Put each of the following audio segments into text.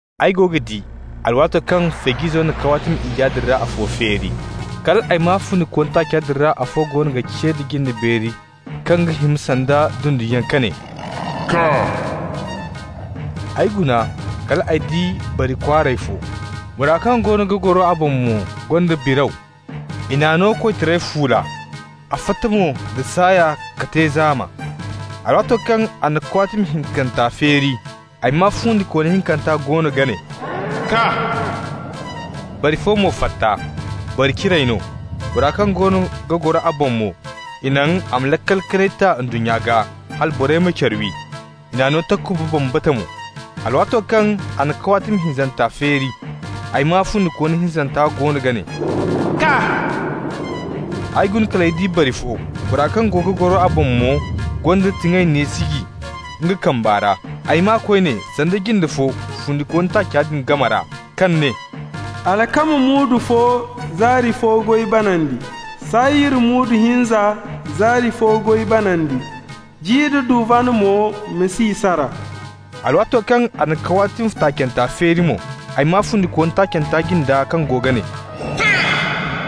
Ay go ga di mo, alwaato kaŋ Feej'izo na kawaatimi iyya din ra afo feeri. Kal ay maa fundikooni taaca din ra afo goono ga ce da jinde kaŋ ga hima sanda dunduyaŋ ka ne: «Kaa!» Ay guna kal ay di bari kwaaray fo. Bora kaŋ goono ga goro a boŋ mo gonda biraw. I n'a no koytaray fuula, a fatta mo da saaya ka te zaama. Alwaato kaŋ a na kawaatimi hinkanta feeri, ay maa fundikooni hinkanta goono ga ne: «Kaa!» Bari fo mo fatta, bari ciray no. Bora kaŋ goono ga goro a boŋ mo, i naŋ a ma laakal kanay ta ndunnya gaa, hala borey ma care wi. I n'a no takuba bambata mo. Alwaato kaŋ a na kawaatimi hinzanta feeri, ay maa fundikooni hinzanta goono ga ne: «Kaa!» Ay guna kal ay di bari bi fo. Bora kaŋ go ga goro a boŋ mo gonda tiŋay neesiji nga kamba ra. Ay maa koyne sanda jinde fo fundikooni taaca din game ra kaŋ ne: «Alkama muudu fo, zaari fo goy banandi, sayir muudu hinza, zaari fo goy banandi, ji nda duvan mo, ma si i sara.» Alwaato kaŋ a na kawaatimi taacanta feeri mo, ay maa fundikooni taacanta jinda kaŋ goono ga ne: «Kaa!»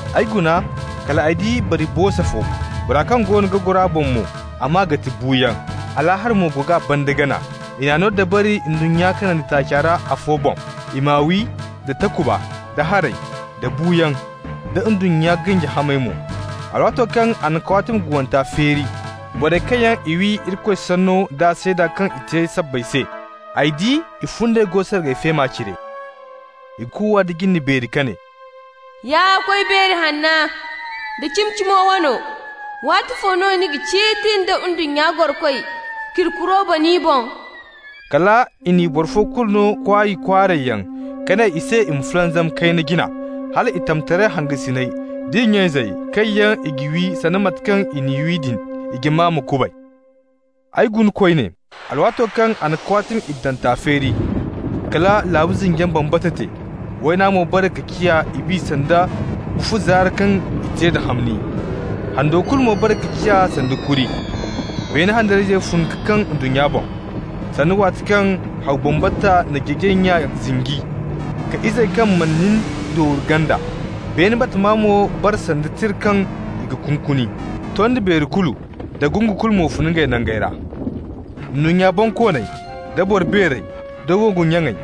Ay guna kal ay di bari boosa fo. Bora kaŋ goono ga goro a boŋ mo, a maa ga ti Buuyaŋ, Alaahara mo go g'a banda gana. I n'i no dabari ndunnya kanandi taaci ra afo boŋ i m'a wi da takuba, da haray, da buuyaŋ, da ndunnya ganji hamey mo. Alwaato kaŋ a na kawaatimi guwanta feeri, borey kaŋ yaŋ i wi Irikoy sanno da seeda kaŋ i te sabbay se, ay di i fundey go sargay feema cire. I kuuwa nda jinde beeri ka ne: «Ya Koy Beero hanna da Cimi-Cimo wano, waatifo no ni ga ciiti da ndunnya gorokoy k'iri kuro bana i boŋ?» Kala i n'i boro fo kulu no kwaay kwaaray yaŋ ka ne i se i ma fulanzam kayna jina, hal i tamtaray hangasiney d'i nya-izey, kaŋ yaŋ i g'i wi sanda mate kaŋ i n'i wi din, i jama ma kubay. Ay guna koyne, alwaato kaŋ a na kawaatimi iddanta feeri. Kala laabu zinjiyaŋ bambata te. Wayna mo bare ka ciya ibi sanda bufu zaara kaŋ i te da hamni. Hando kulu mo bare ka ciya sanda kuri. Beene handariyayzey fun ka kaŋ ndunnya boŋ, sanda waati kaŋ haw bambata na jeejay nya zinji k'a izey kaŋ mana nin dooru ganda. Beene batama mo bara sanda tira kaŋ i g'a kunkuni. Tondi beeri kulu da gungu kulu mo fun ngey nangey ra. Ndunnya bonkooney, da boro beerey, da wongu nyaŋey,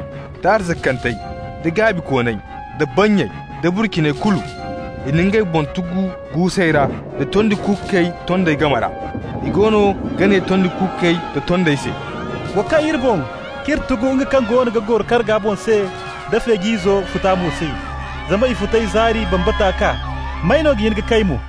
da arzakantey, da gaabikooney, da bannyey da burciney kulu, i na ngey boŋ tugu guusey ra da tondi kuukey tondey game ra. I goono ga ne tondi kuukey da tondey se: «Wa kaŋ iri boŋ, k'iri tugu nga kaŋ goono ga goro karga boŋ se da Feej'izo futa mo se. Zama i futay zaari bambata kaa. May no ga hin ka kay mo?»